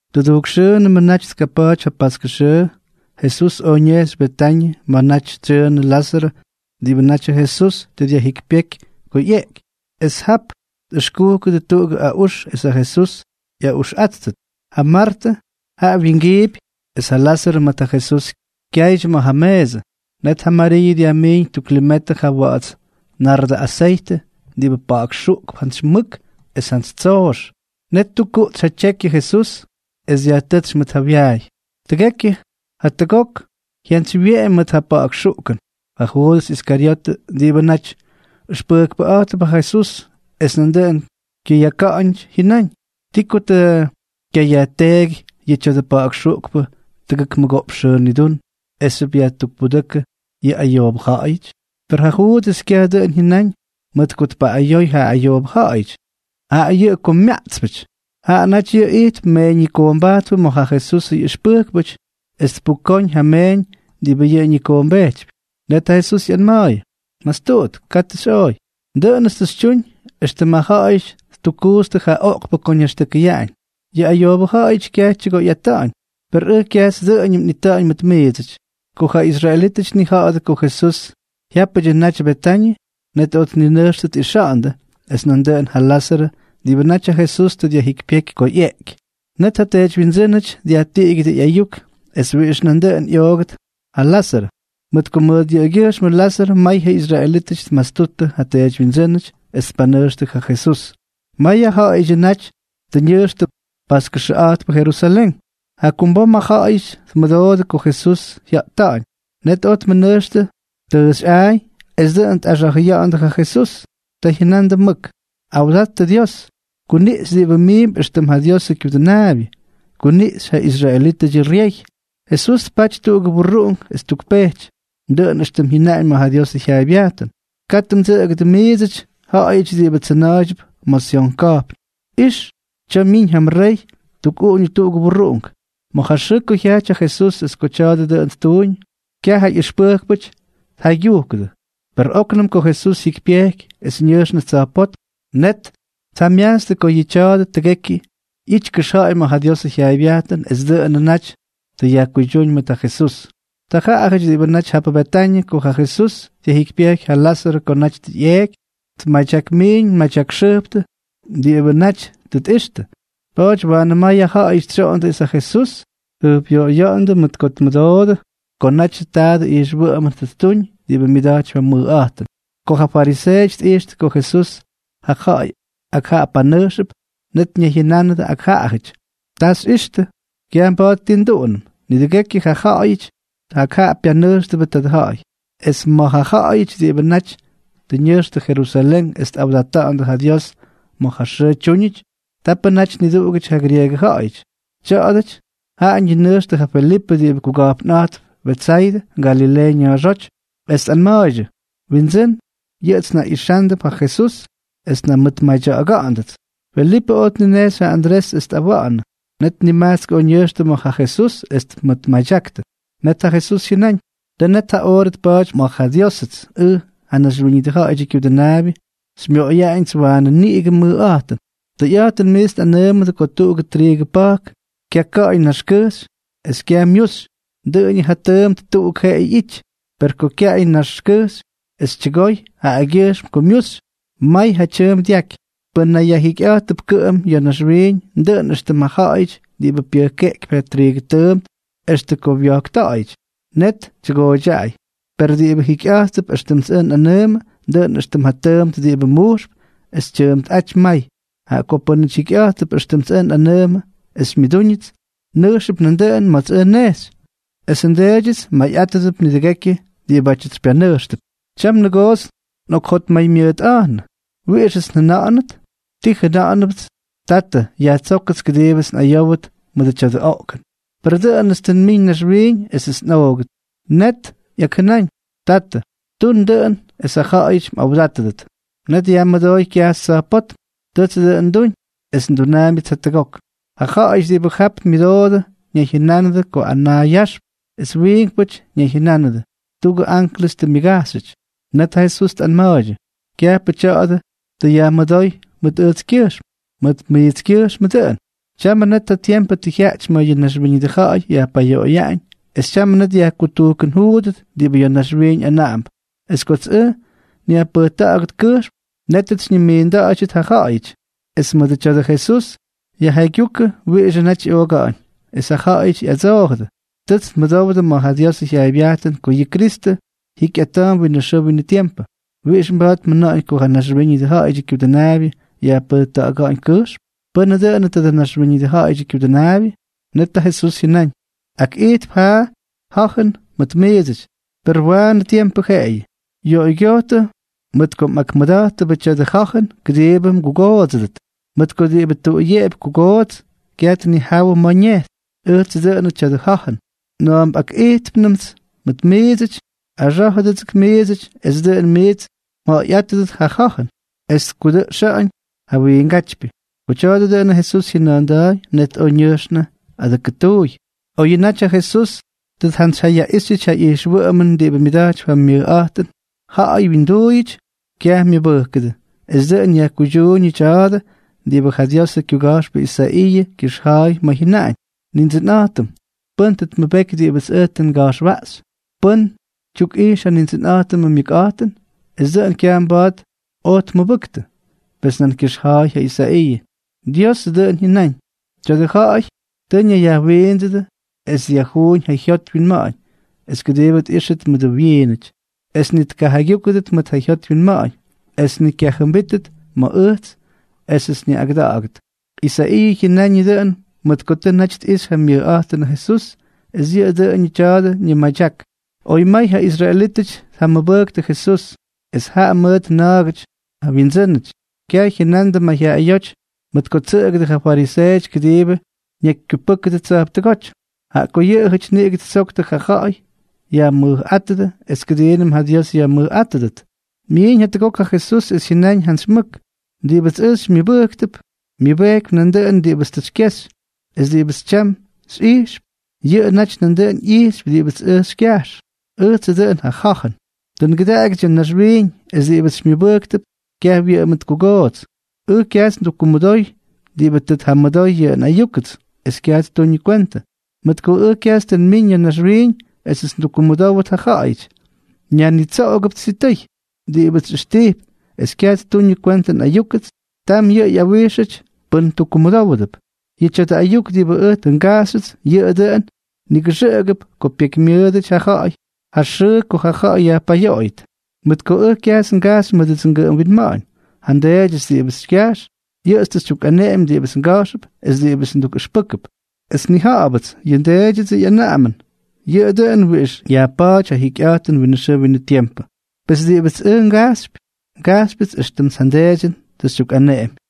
Tʉdujk xʉʉnʉmʉ naty tkapa̱a̱ty ja paskʉ xʉʉ, Jesús oj ñejxy Betañʉ ma̱ naty tsyʉʉnʉ Lázarʉ diꞌibʉ natyʉ Jesús tʉ dyajjikypyéky ko ꞌyeꞌky. Es jap tꞌʉxkujkʉdʉ tuꞌugʉ aꞌux es ja Jesús ꞌyaꞌuxꞌátʉt; ja Martʉ jaꞌa wingiipy es ja Lázarʉ mʉt ja Jesús kyaydyʉ ma̱ ja meesʉ. Net ja Mariiʉ dyajmiiñ tuk limetʉ ja wa̱ꞌa̱ts nardʉ aseytʉ diꞌibʉ pa̱ꞌa̱kxuꞌkp jantsy mʉk es jantsy tsoox. Net ttukkuꞌtsy ja tyekyʉ Jesús es dyajtʉ́tsy mʉt ja wyaay. Tʉgekyʉ ja tʉgot jyantsywyeꞌemy mʉt ja pa̱ꞌa̱k xuꞌkʉn. Ja Juudʉs Iskaryotʉ, diꞌibʉ naty ʉxpʉjkpʉꞌa̱jtʉp ja Jesús es nandʉꞌʉn kyʉyaka̱ꞌa̱ñʉty, jyʉnáñ: —¿Ti ko tʉ kyayajteeky yʉ tya̱dʉ pa̱ꞌa̱k xuꞌkʉn tʉgʉk mʉgoꞌpx xʉʉ nidún esxyʉp yajtukpudʉ́kʉ yʉ ayoobʉ ja̱ꞌa̱yʉty? Per ja Juudʉs kyaj dʉꞌʉn jyʉnáñ mʉt ko tpaꞌꞌayoy ja ayoobʉ ja̱ꞌa̱yʉty, jaꞌa yʉꞌʉ ko myaꞌtspʉty. Yʉꞌʉ naty ijtp meeññikoombajtpʉ ma̱ ja Jesusʉ ꞌyʉxpʉjkpʉty es tpukóñ ja meeñ diꞌibʉ yʉꞌʉ ñikoombejtypy. Net ja Jesús ꞌyanma̱a̱yʉ: —¡Mastuꞌut! ¡Katʉ xyꞌooy! Dʉꞌʉnʉts tʉ xytyuñ éxtʉm ja ja̱ꞌa̱yʉty ttukkuutstʉ ja oꞌkpʉ ko ñaxtʉkʉyaꞌañ. Yʉ ayoobʉ ja̱ꞌa̱yʉty kyaj tyʉgoyꞌata̱ꞌa̱ñ, per ʉj kyajts dʉꞌʉñʉm nꞌita̱ꞌa̱ñ mʉt miidsʉty. Ko ja israelítʉty tnija̱ꞌa̱dʉ ko Jesús jyápʉdyʉ naty Betañʉ, net oj tninʉjxtʉ tꞌixa̱ꞌa̱ndʉ es nandʉꞌʉn ja Lázarʉ diꞌibʉ naty ja Jesús tʉ dyajjikypyéky ko ꞌyeꞌky. Net ja teedywyindsʉ́nʉty dyajtiꞌigyʉdʉ ꞌyayuk es wiꞌix nandʉꞌʉn ꞌyoogʉt ja Lázarʉ, mʉt ko mʉt yʉꞌʉgyʉjxmʉ Lázarʉ may ja israelítʉty tmastuttʉ ja teedywyindsʉ́nʉty es tpanʉjxtʉ ja Jesús. May ja ja̱ꞌa̱yʉdyʉ naty tʉ ñʉjxtʉ paskʉxʉꞌa̱jtpʉ Jerusalén. Jakumbom ja ja̱ꞌa̱yʉty tmʉdoodʉ ko Jesús jya̱ꞌta̱ꞌa̱ñ. Net oj tmʉnʉjxtʉ tʉʉxy a̱a̱y es dʉꞌʉn tꞌaxa̱jʉya̱ꞌa̱ndʉ ja Jesús. Ta jyʉnandʉ mʉk: —¡Awdattʉ Dios! ¡Kuniꞌxy diꞌibʉ miimp éxtʉm ja Diosʉ Kyudʉnaabyʉ! ¡Kuniꞌxy ja Israelitʉ Ryey! Jesús tpaty tuꞌugʉ burruꞌunk es ttukpejty, dʉꞌʉn éxtʉm jyʉnaꞌañ ma̱ ja Diosʉ jyaaybyajtʉn: Katʉ mdsʉꞌʉgʉdʉ miidsʉty, ja̱ꞌa̱yʉty diꞌibʉ tsʉna̱a̱ydyʉp ma̱ Syon ka̱jpn. Ix, tya̱a̱ myiñ ja mrey ttukꞌuꞌuñʉ tuꞌugʉ burruꞌunk. Ma̱ ja xʉʉ ko jyajty ja Jesús es ko tya̱a̱dʉ dʉꞌʉn ttuñ, kyaj ja ꞌyʉxpʉjkpʉty tjaygyujkʉdʉ. Per óknʉm ko Jesús jyikypyejky es ñʉjxnʉ tsa̱jpótm, net tjamyajtstʉ ko yʉ tya̱a̱dʉ tʉgekyʉ ꞌyity kʉxja̱ꞌa̱y ma̱ ja Diosʉ jyaaybyajtʉn es dʉꞌʉnʉ naty tʉ yajkuydyúñ mʉt ja Jesús. Ja ja̱ꞌa̱yʉty diꞌibʉ naty jap Betañʉ ko ja Jesús dyajjikypyejky ja Lázarʉ ko naty tʉ ꞌyeeky, tmadyakmiin tmadyakxʉjptʉ diꞌibʉ naty tʉ tꞌixtʉ. Pa̱a̱ty waanʉ may ja ja̱ꞌa̱yʉty tsyoꞌondʉ es ja Jesús tjʉjpꞌyoꞌoya̱ꞌa̱ndʉ mʉt ko tmʉdoodʉ ko naty ja tadʉ ijxwʉꞌʉmʉn tʉ ttuñ diꞌibʉ myʉda̱jtypy ja mʉjꞌa̱jtʉn. Ko ja fariseeʉty tꞌijxtʉ ko Jesús ja ja̱ꞌa̱y ak jaꞌa panʉjxʉp, net ñayjyʉnánʉdʉ ak jaꞌajʉty: —Ta xyꞌixtʉ. Kyaj mba̱a̱t ti nduꞌunʉm. ¡Nidʉgekyʉ ja ja̱ꞌa̱yʉty ak jaꞌa pyanʉjxtʉbʉ tadʉ ja̱ꞌa̱y! Es ma̱ ja ja̱ꞌa̱yʉty diꞌibʉ naty tʉ ñʉjxtʉ Jerusalén es tꞌawdata̱ꞌa̱ndʉ ja Dios ma̱ ja xʉʉ tyúñʉty, tapʉ naty niduꞌugʉty ja grieegʉ ja̱ꞌa̱yʉty. Tya̱a̱dʉty jaꞌa ñinʉjxtʉ ja Felipʉ diꞌibʉ kuga̱jpnꞌa̱jtp Betsaydʉ, Galileeʉ ña̱a̱xóty, es tꞌanma̱a̱ydyʉ: —Windsʉ́n, yʉꞌʉts njaꞌixándʉp ja Jesús es njamʉtmadya̱ꞌa̱ga̱ꞌa̱ndʉts. Felipʉ oj tninejxy ja Andrés es tꞌawa̱ꞌa̱nʉ. Net nimajtsk oj ñʉjxtʉ ma̱ ja Jesús es tmʉmadyaktʉ. Net ja Jesús jyʉnáñ: —Tʉ net ja oorʉ tpa̱a̱ty ma̱ ja Diósʉts ʉj, ja Naxwíñʉdʉ Ja̱ꞌa̱yʉdyʉ Kyudʉnaabyʉ, xymyoꞌoyaꞌañʉts waanʉ niꞌigʉ mʉjꞌa̱jtʉn. ’Tʉyꞌa̱jtʉn miits nꞌanʉʉmʉdʉ ko tuꞌugʉ triigʉ pa̱jk kyaka̱ꞌa̱y na̱a̱xkʉjxy es kyaj myuxy, dʉꞌʉñʉ ja tʉʉmt tuꞌuk jeꞌeyʉ ꞌyity, per ko kyaꞌay na̱a̱xkʉjxy es tyʉgoy jaꞌagyʉjxm ko myuxy, may ja tyʉʉmp dyaky. Pʉ́n nayyajjikyꞌa̱jtʉp kʉꞌʉm ya̱ naxwiiñ, dʉꞌʉn éxtʉm ja ja̱ꞌa̱yʉty diꞌibʉ pyʉjkeꞌkypy ja triigʉ tʉʉmt extʉ ko wyojkta̱ꞌa̱yʉty, net tyʉgooydyaꞌay. Per diꞌibʉ jikyꞌa̱jtp éxtʉmts ʉj nꞌanʉʉmʉ, dʉꞌʉn éxtʉm ja tʉʉmt diꞌibʉ mujxp es tyʉʉmpꞌáty may. Jaꞌa ko pʉ́nʉty jikyꞌa̱jttʉp éxtʉmts ʉj nꞌanʉʉmʉ es xymyʉdúñʉts, nʉjxʉp nandʉꞌʉn ma̱ts ʉj nnejxy, esʉ nDeedyʉts mayꞌátʉdʉp nidʉgekyʉ diꞌibátyʉts xypyanʉjxtʉp. ’Tyam nʉgoots nꞌokjotmaymyʉʉtꞌa̱jnʉ. ¿Wiꞌixʉts njʉna̱ꞌa̱nʉt? ¿Ti njʉna̱ꞌa̱nʉpts?: “Tatʉ, yajtsókʉts kʉdiibʉts nꞌayówʉt ma̱ tya̱dʉ oꞌkʉn.” Per dʉꞌʉnʉts tʉ nmiñ naxwiiñ esʉts nꞌoogʉt. Net ꞌyakjʉnáñ: “Tatʉ, tun dʉꞌʉn es ja ja̱ꞌa̱yʉty mꞌawdátʉdʉt.” Net yajmʉdooy kyajxy tsa̱jpótm: —Tʉts dʉꞌʉn nduñ, es ndunaambyʉts jatʉgok. Ja ja̱ꞌa̱yʉty diꞌibʉ jap myʉdoodʉ ñayjyʉnánʉdʉ ko anaa yaxp. Es wiinkpʉty ñayjyʉnánʉdʉ: —Tuꞌugʉ anklʉs tʉ myʉgajxyʉty. Net ja Jesús tꞌanma̱a̱ydyʉ: —Kyajpʉ tya̱a̱dʉ tʉ yajmʉdóy mʉt ʉjtskyʉjxm, mʉt miitskyʉjxmʉdyʉ dʉꞌʉn. Tyamʉ net ja tiempʉ tʉ jyaꞌty ma̱ yʉ naxwíñʉdʉ ja̱ꞌa̱y yajpayoꞌoyaꞌañ, es tyamʉ net yajkutujkʉnjuudʉt diꞌibʉ ya̱ naxwiiñ anaꞌamp. Es kots ʉj nyajpʉjta̱ꞌa̱gʉt kʉjxm, nétʉts xyñimiinda̱ꞌa̱ydyʉdʉts ja ja̱ꞌa̱yʉty. Es mʉdʉ tya̱a̱dʉ Jesús yajjaygyujkʉ wiꞌixʉ naty ꞌyooga̱ꞌa̱ñ. Es ja ja̱ꞌa̱yʉty ꞌyadsoojʉdʉ: —Tʉts nmʉdowdʉ ma̱ ja Diosʉ jyaaybyajtʉn ko yʉ Kristʉ jikyꞌata̱a̱mp winʉ xʉʉ winʉ tiempʉ. ¿Wiꞌix mij mjʉna̱ꞌa̱ñ ko ja Naxwíñʉdʉ Ja̱ꞌa̱yʉdyʉ Kyudʉnaabyʉ yajpʉjta̱ꞌa̱ga̱ꞌa̱ñ kʉjxm? ¿Pʉ́nʉ dʉnʉ tadʉ Naxwíñʉdʉ Ja̱ꞌa̱yʉdyʉ Kyudʉnaabyʉ? Net ja Jesús jyʉnáñ: —Akꞌijtp ja ja̱jʉn mʉt miidsʉty, per waanʉ tiempʉ jeꞌeyʉ. Yoꞌoygyojtʉ mʉt ko mꞌakmʉda̱jttʉbʉ tya̱dʉ ja̱jʉn kʉdiibʉ mgugoodsʉdʉt. Mʉt ko diꞌibʉ tuꞌuyeꞌepy kugoots, kyaj tnijawʉ ma̱ ñejxy. Ʉjtsʉ dʉꞌʉnʉ tya̱dʉ ja̱jʉn. Na̱a̱m nꞌakꞌijtpnʉmts mʉt miidsʉty, axá̱jʉdʉgʉts miidsʉty es dʉꞌʉn miits mja̱ꞌa̱yꞌátʉdʉt ja ja̱jʉn es tkudʉꞌxa̱ꞌa̱ñ ja wiingátypyʉ. Ko tya̱a̱dʉ dʉꞌʉn Jesús jyʉna̱a̱nda̱a̱y, net oj ñʉjxnʉ adʉkʉtuuy. Oyʉ naty ja Jesús tʉ tjantsyjyayaꞌíxyʉty ja ijxwʉꞌʉmʉn diꞌibʉ myʉda̱jtypy ja mʉjꞌa̱jtʉn ja̱ꞌa̱y wyinduuyʉty, kyaj myʉbʉjkʉdʉ. Es dʉꞌʉn yajkuydyuuñʉ tya̱a̱dʉ diꞌibʉ ja Diosʉ kyuga̱jxpʉ Isaiiʉ kyʉxja̱a̱y ma̱ jyʉnáñ: Nindsʉnꞌa̱jtʉm, ¿pʉ́n tʉ tmʉbeky diꞌibʉts ʉj tʉ nga̱jxwaꞌxy? ¿Pʉ́n tyukꞌijx ja Nindsʉnꞌa̱jtʉmʉ myʉkꞌa̱jtʉn? Es dʉꞌʉn kyaj mba̱a̱t oj tmʉbʉktʉ. Pes nan kyʉxja̱a̱y ja Isaiiʉ: Dios dʉꞌʉn jyʉnáñ: “Tya̱dʉ ja̱ꞌa̱y tʉ ñayyajwiindsʉdʉ es dyajjuuñ ja jyot wyinma̱ꞌa̱ñ, es kʉdiibʉ tꞌíxtʉt mʉdʉ wyiinʉty, es ni tkajaygyúkʉdʉt mʉt ja jyot wyinma̱ꞌa̱ñ, es ni kyajʉmbíttʉt ma̱ ʉj esʉts nyaꞌꞌagʉda̱ꞌa̱gʉt.” Isaiiʉ jyʉnañʉ dʉꞌʉn mʉt ko tʉ naty tꞌixy ja myʉjꞌa̱jtʉnʉ Jesús, es yʉꞌʉ dʉnʉ tya̱a̱dʉ ñimadyak. Oy may ja israelítʉty tjamʉbʉktʉ Jesús, es jaꞌa mʉt na̱a̱gʉty ja wyindsʉ́nʉty, kyaj jyʉnandʉ mayjyaꞌayóty mʉt ko ttsʉꞌʉgʉdʉ ja fariseeʉty kʉdiibʉ ñakykyupʉ́kʉdʉt tsa̱jptʉgóty. Jaꞌa ko yʉꞌʉjʉty niꞌigʉ ttsoktʉ ko ja ja̱ꞌa̱y yajmʉjꞌátʉdʉ es kʉdiinʉm ja Dios yajmʉjꞌátʉdʉt. Myiiñ jatʉgok ja Jesús es jyʉnáñ jantsy mʉk: —Diꞌibʉts ʉj xymyʉbʉjkp, myʉbejkypy nandʉꞌʉn diꞌibʉts tʉ xykyexy. Es diꞌibʉts tyam xyꞌijxp, yʉꞌʉ naty nandʉꞌʉn ꞌyijxypy diꞌibʉts ʉj xykyajx. Ʉjtsʉ dʉꞌʉn ja ja̱jʉn. Tʉ ngʉdaꞌagyʉts ya̱ naxwiiñ es diꞌibʉts xymyʉbʉjkp kyaj wyʉꞌʉmʉt kugoots. Ʉj kyajts ndukkumʉdoy diꞌibʉ tʉ tjamʉdoy yʉ nꞌayúkʉts es kyaj ttuñʉ kwentʉ, mʉt ko ʉj kyajts tʉ nmiñ ya̱ naxwiiñ esʉts ndukkumʉdówʉt ja ja̱ꞌa̱yʉty, nyajnitsoꞌogʉpts sitʉy. Diꞌibʉts xyꞌʉxtijp es kyaj ttuñʉ kwentʉ nꞌayúkʉts, tam yʉꞌʉ ꞌyawíxyʉty pʉ́n tukkumʉdówʉdʉp. Yʉ tya̱dʉ ayuk diꞌibʉ ʉj tʉ ngajxyʉts, yʉꞌʉ dʉꞌʉn nigʉxʉꞌʉgʉp ko pekymyʉʉt ja ja̱ꞌa̱y ja xʉʉ ko ja̱ꞌa̱y yajpayoꞌoydyʉt. Mʉt ko ʉj kyajts ngajxy mʉdʉdsʉ ngʉꞌʉm winma̱ꞌa̱ñ, ja nDeedyʉts diꞌibʉts xykyajx, yʉꞌʉts tʉ xytyukꞌaneꞌemy diꞌibʉts nga̱jxʉp es diꞌibʉts ndukꞌʉxpʉ́kʉp. Es nnija̱ꞌa̱bʉts yʉ nDeedyʉdsʉ ꞌyanaꞌamʉn, yʉꞌʉ dʉꞌʉn wiꞌix yajpa̱a̱ty ja jikyꞌa̱jtʉn winʉ xʉʉ winʉ tiempʉ. Pes diꞌibʉts ʉj ngajxypy, ngajxypyʉts éxtʉmts ja nDeedyʉn tʉ xytyukꞌaneꞌemy.